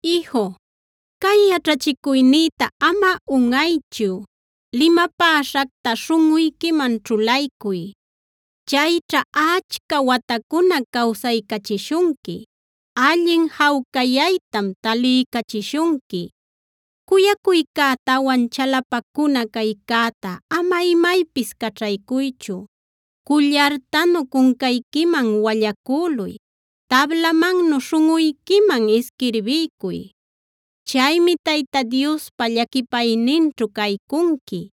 Iju, cay yaćhachicuynïta ama unꞌaychu; limapäśhacta śhunꞌuyquiman ćhulaycuy. Chayćha achca watacuna cawsaycachishunqui; allin jawcayaytam taliycachishunqui. Cuyacuycätawan chalapacuna caycäta ama imaypis caćhaycuychu: cullartanu cuncayquiman wallacüluy, tablamannu śhunꞌuyquiman isquirbiycuy. Chaymi Tayta Diospa llaquipayninćhu caycunqui;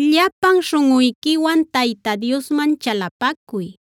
Llapan śhunꞌuyquiwan Tayta Diosman chalapacuy;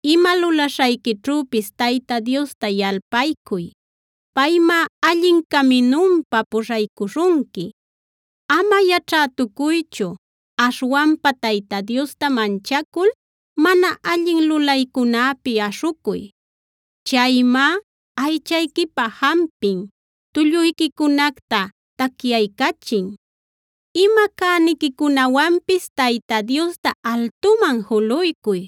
Ima lulaśhayquićhüpis Tayta Diosta yalpaycuy; paymá allin caminunpa puśhaycuśhunqui. Ama yaćhätucuychu; aśhwanpa Tayta Diosta manchacul mana allin lulaycunäpi aśhucuy. Chaymá aychayquipä jampin, tulluyquicunacta tacyaycachin. Ima cäniquicunawanpis Tayta Diosta altuman juluycuy,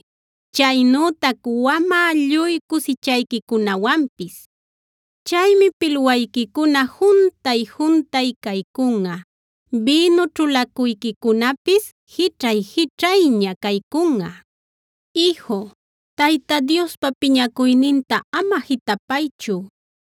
chaynütac wamä lluy cusichayquicunawanpis. Chaymi pilwayquicuna juntay-juntay caycunꞌa; bïnu ćhulacuyquicunapis jićhay-jićhayña caycunꞌa. Iju, Tayta Diospa piñacuyninta ama jitapaychu;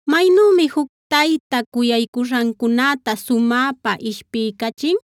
Maynümi juc tayta cuyaycuśhancunäta sumäpa ishpiycachin,d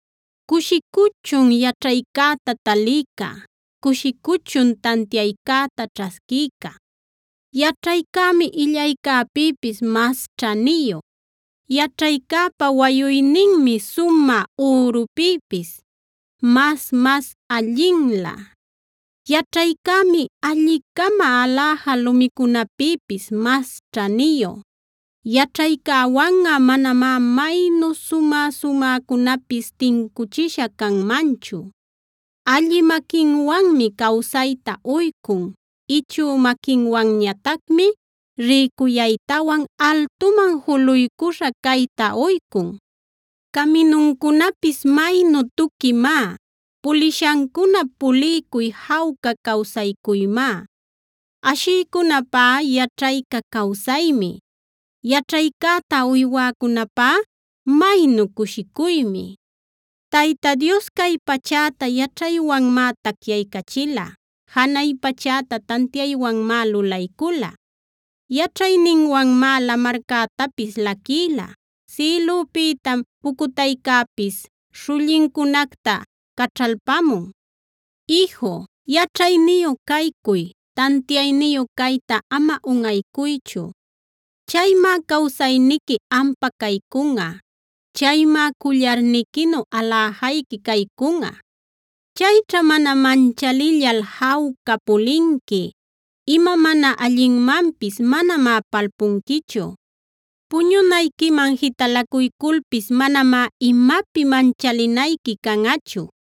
Cushicuchun yaćhaycäta talïca; cushicuchun tantiaycäta ćhasquïca. Yaćhaycämi illaycäpïpis mas ćhaniyu; yaćhaycäpa wayuyninmi sumä ürupïpis mas-mas allinlä. Yaćhaycämi alli-cama aläja lumicunäpïpis mas ćhaniyu; yaćhaycäwanꞌa manamá maynu sumä-sumäcunapis tincuchisha canmanchu. Allï maquinwanmi cawsayta uycun; ichü maquinwanñatacmi rïcuyaytawan altuman juluycuśha cayta uycun. Caminuncunapis maynu tuquimá; pulishancunap puliycuy jawca cawsaycuymá. Ashïcunäpá yaćhayca cawsaymi; yaćhaycäta uywäcunäpá maynu cushicuymi. Tayta Dios cay pachäta yaćhaywanmá tacyaycachila; janay pachäta tantiaywanmá lulaycula. Yaćhayninwanmá lamarcätapis laquïla; sïlüpïtam pucutaycäpis śhullincunacta caćhalpamun. Iju, yaćhayniyu caycuy; tantiayniyu cayta ama unꞌaycuychu. Chaymá cawsayniqui ampa caycunꞌa; chaymá cullarniquinu aläjayqui caycunꞌa. Chayćha mana manchalillal jawca pulinqui; ima mana allinmanpis manamá palpunquichu. Puñunayquiman jitalacuyculpis manamá imapi manchalinayqui canꞌachu;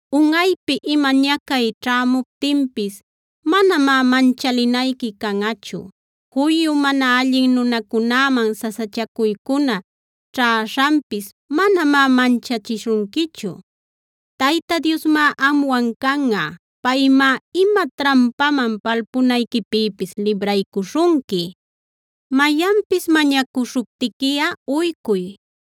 Unꞌaypi ima ñacay ćhämuptinpis manamá manchalinayqui canꞌachu; juyu mana allin nunacunäman sasachacuycuna ćhäśhanpis manamá manchachishunquichu. Tayta Diosmá amwan canꞌa; paymá ima trampaman palpunayquipïpis libraycuśhunqui. Mayanpis mañacuśhuptiquiꞌa uycuy;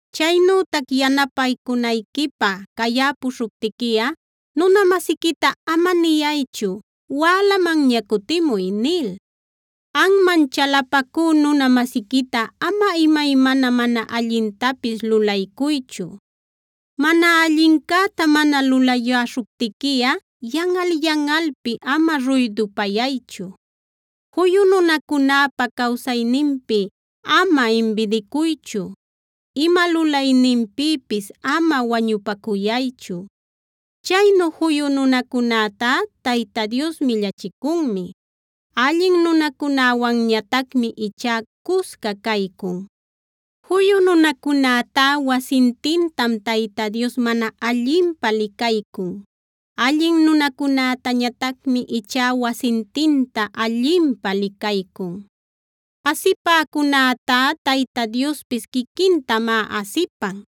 Chaynütac yanapänayquipä cayäpuśhuptiquiꞌa nuna-masiquita ama niyaychu: “Wälamanña cutimuy” nil. Anman chalapacü nuna-masiquita ama imaymana mana allintapis lulaycuychu. Mana allincäta mana lulayäśhuptiquiꞌa yanꞌal-yanꞌalpi ama ruydupayaychu. Juyu nunacunäpa cawsayninpi ama imbidicuychu; ima lulayninpïpis ama wañupacuyaychu. Chaynu juyu nunacunätá Tayta Dios millachicunmi; allin nunacunäwanñatacmi ichá cusca caycun. Juyu nunacunätá wasintintam Tayta Dios mana allinpä licaycun; allin nunacunätañatacmi ichá wasintinta allinpä licaycun. Asipäcunätá Tayta Diospis quiquintamá asipan;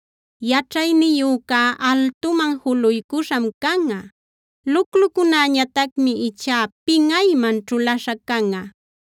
Yaćhayniyücá altuman juluycuśham canꞌa; luclucunäñatacmi ichá pinꞌayman ćhulaśha canꞌa.